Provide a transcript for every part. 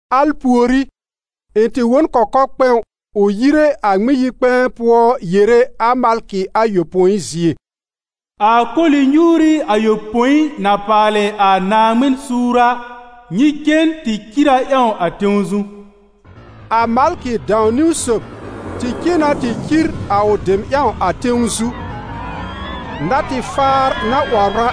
Al pùorí, ɩ̃ tɩ wõ n kɔkɔ-kpɛ̃w ʋ yire a Ŋmɩn-yi-kpɛ̃ɛ pʋɔ yere a malkɩ ayopõi zie: «A koli-nyuuri ayopõi na paalɩ a Naaŋmɩn suur a, nyɩ cen tɩ cir a ƴãw a tẽw zu.» A malkɩ dãw-niwn sob tɩ cen na tɩ cir a ʋ dem ƴãw a tẽw zu. Natɩ-faar na 'wɔbr a,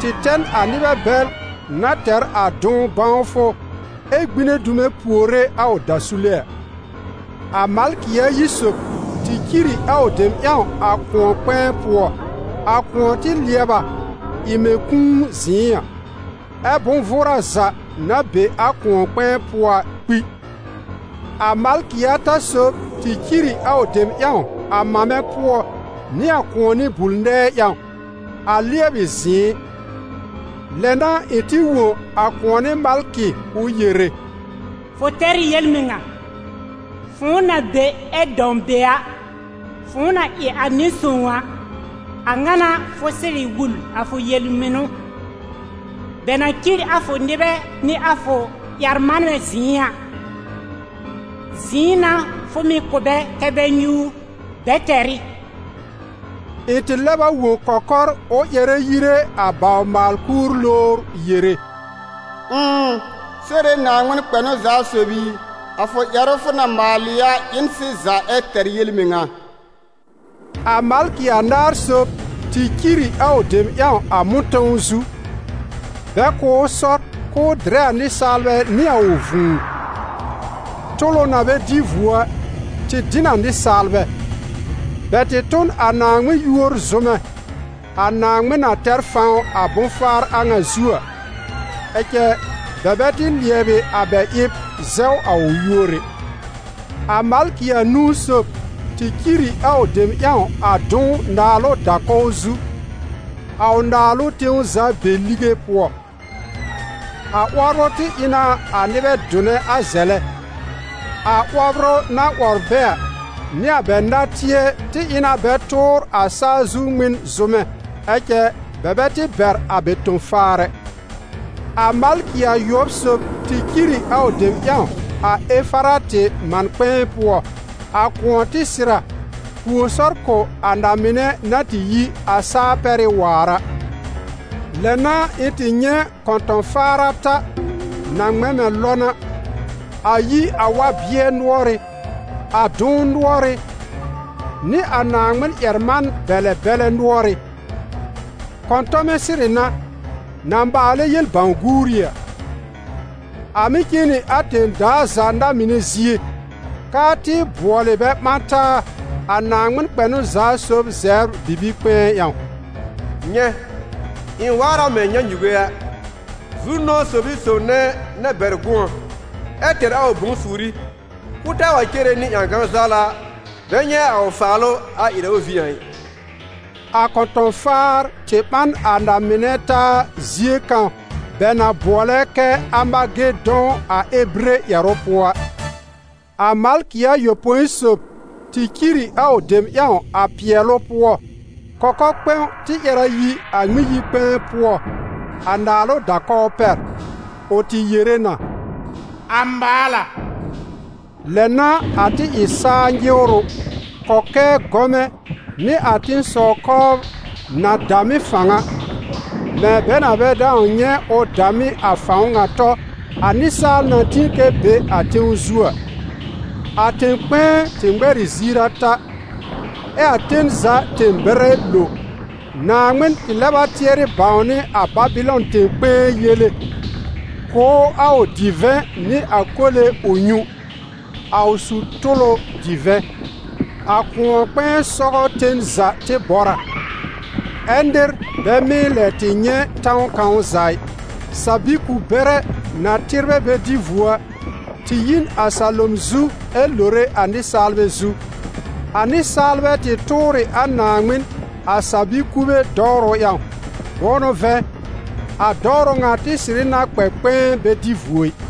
tɩ tɛ n a nɩbɛ bɛl na tɛr a dʋ̃w bãwfʋ ɛ gbine dume puore a ʋ dasule a. A malkɩ ayi sob tɩ cir ɩ a ʋ dem ƴãw a kʋ̃ɔ-kpɛ̃ɛ pʋɔ. A kʋ̃ɔ tɩ lɩɛb a, ɩ mɛ̃ kũu zɩ̃ɩ a, ɛ́ bʋ̃-vʋʋra za na be a kʋ̃ɔ-kpɛ̃ɛ pʋɔ a kpi. A malkɩ ata sob tɩ cir ɩ a ʋ dem ƴãw a mamɛ pʋɔ nɩ a kʋ̃ɔnɩ bul-nɛɛ ƴãw, a lɩɛbɩ zɩ̃ɩ. Lɛ n'a ɩ̃ tɩ wõ a kʋ̃ɔnɩ malkɩ ʋ yere: «Fʋ tɛr ɩ yel-mɩŋa, fʋ̃ʋ na be ɛ dãw be a, fʋ̃ʋ na ɩ a Nɩ-Sõw a, a ŋa n'a fʋ sɩrɩ wul a fʋ yel-mɩnʋ. Bɛ na cir a fʋ nɩbɛ nɩ a fʋ ƴɛr-manbɛ zɩ̃ɩ a, zɩ̃ɩ n'a fʋ mɩ̀ kʋ̀ bɛ kɛ́ bɛ nyúur. Bɛ tɛr ɩ!» Ɩ̃ tɩ lɛb a wõ kɔkɔr ʋ ƴɛrɛ yire a bawr-maal-kúur lowr yere: «Ʋ̃ʋ, Sore Naaŋmɩn kpɛnʋ-za-sob i, a fʋ ƴɛrʋ fʋ na maalɩ a ɩ n sɩza ɛ tɛr yel-mɩŋa.» A malkɩ anaar sob tɩ cir ɩ a ʋ dem ƴãw a mʋ̃tɔ̃w zu, bɛ kʋ̀ ʋ sɔr k'ʋʋ dɩrɛ a nɩsaalbɛ nɩ a ʋ vũu. Tʋlʋ na bɛ dɩ vuo a, tɩ dɩ n a nɩsaalbɛ; bɛ tɩ tʋ n a Naaŋmɩn yúor zʋmɛ, a Naaŋmɩn na tɛr fãw a bʋ̃-faar a ŋa zu a, ɛ cɛ, bɛ bɛ tɩ lɩɛbɩ a bɛ ɩb zɛw a ʋ yúor ɛ. A malkɩ anũu sob tɩ cir ɩ a ʋ dem ƴãw a dʋ̃w naalʋ da-kɔw zu, a ʋ naalʋ tẽw za be lige pʋɔ. A 'wɔbrʋ tɩ ɩ na a nɩbɛ dʋnɛ a zɛlɛ; a 'wɔbrʋ na 'wɔbr bɛ a, nɩ a bɛ natɩɛ tɩ ɩ na bɛ tʋʋr a saa zu Ŋmɩn zʋmɛ. Ɛ cɛ, bɛ bɛ tɩ bɛr a bɛ tõ-faar ɛ. A malkɩ ayʋɔb sob tɩ cir ɩ a ʋ dem ƴãw a Efaratɩ man-kpɛ̃ɛ pʋɔ. A kʋ̃ɔ tɩ sɩr a, pùo sɔr kʋ̀ a na-mɩnɛ na tɩ yi a saa-pɛrɩ́ waar a. Lɛ n'a ɩ̃ tɩ nyɛ̃ kɔ̃tɔ̃-faar ata, na ŋmɛ̃ mɛ̃ lɔn a, a yi a wa-bɩɛ nʋɔrɩ́, a dʋ̃w nʋɔrɩ́ nɩ a Naaŋmɩn ƴɛr-man-bɛlɛ bɛlɛ nʋɔrɩ́. Kɔ̃tɔmɛ̃ sɩrɩ n'a, na maalɛ yel-bãw-guuri a. A mɩ́ cen nɩ a tẽ-daa za na-mɩnɛ zie, k'aa tɩ bʋɔlɩ bɛ ɓã taa a Naaŋmɩn kpɛnʋ-za-sob zɛbr bibi-kpɛ̃ɛ ƴãw. «Nyɛ̃, ɩ̃ waar a mɛ̃ nyãnyuge a! Zu-nʋ̃ɔ sob ɩ sob nɛ na bɛr gʋ̃ɔ ɛ tɛr a ʋ bʋ̃-suuri, k'ʋʋ taa wa cere nɩ ƴãgan-zawla bɛ nyɛ̃ a ʋ faalʋ a ɩrɛ ʋ vĩ a ɩ.» A kɔ̃tɔ̃-faar tɩ ɓã n a na-mɩnɛ taa zie kãw bɛ na bʋɔlɛ kɛ́ Amagedɔ̃ a ebire ƴɛrʋ pʋɔ a. A malkɩ ayopõi sob tɩ cir ɩ a ʋ dem ƴãw a pɩɛlʋ pʋɔ. Kɔkɔ-kpɛ̃w tɩ ƴɛr a yi a Ŋmɩn-yi-kpɛ̃ɛ pʋɔ, a naalʋ da-kɔw pɛr. Ʋ tɩ yere na: «A maal a.» Lɛ n'a a tɩ ɩ saa nyɩwrʋ, kɔkɛɛ gɔmɛ nɩ a tẽ-sɔw-kɔbr na dam ɩ fãw a, mɛ̃ bɛ na bɛ dãw nyɛ̃ ʋ dam ɩ a fãw ŋa tɔ, a nɩsaal na tĩ kɛ be a tẽw zu a. A tẽ-kpɛ̃ɛ tɩ ŋmɛr ɩ ziir ata, ɛ a ten za tẽ-bɛrɛ lo. Naaŋmɩn tɩ lɛb a tɩɛrɩ bãwnɩ a Babɩlɔn tẽ-kpɛ̃ɛ yele, kʋ̀ ʋ a ʋ divɛ̃ nɩ a kole ʋ nyũ, a ʋ su-tʋlʋ divɛ̃. A kʋ̃ɔ-kpɛ̃ɛ sɔgɔ ten za tɩ bɔr a, ɛ́ nɩr bɛ mɩ́ lɛ tɩ nyɛ̃ tãw kãw za ɩ. Sa-bi-ku-bɛrɛ, na tɩbrɛ bɛ dɩ vuo a, tɩ yi n a salom zu ɛ lore a nɩsaalbɛ zu. A nɩsaalbɛ tɩ tʋʋr ɩ a Naaŋmɩn a sa-bi-kube dɔwrʋ ƴãw, bʋ̃ʋ n'ʋ vɛ̃, a dɔwrʋ ŋa tɩ sɩrɩ na kpɛ kpɛ̃ɛ bɛ dɩ vuo ɩ.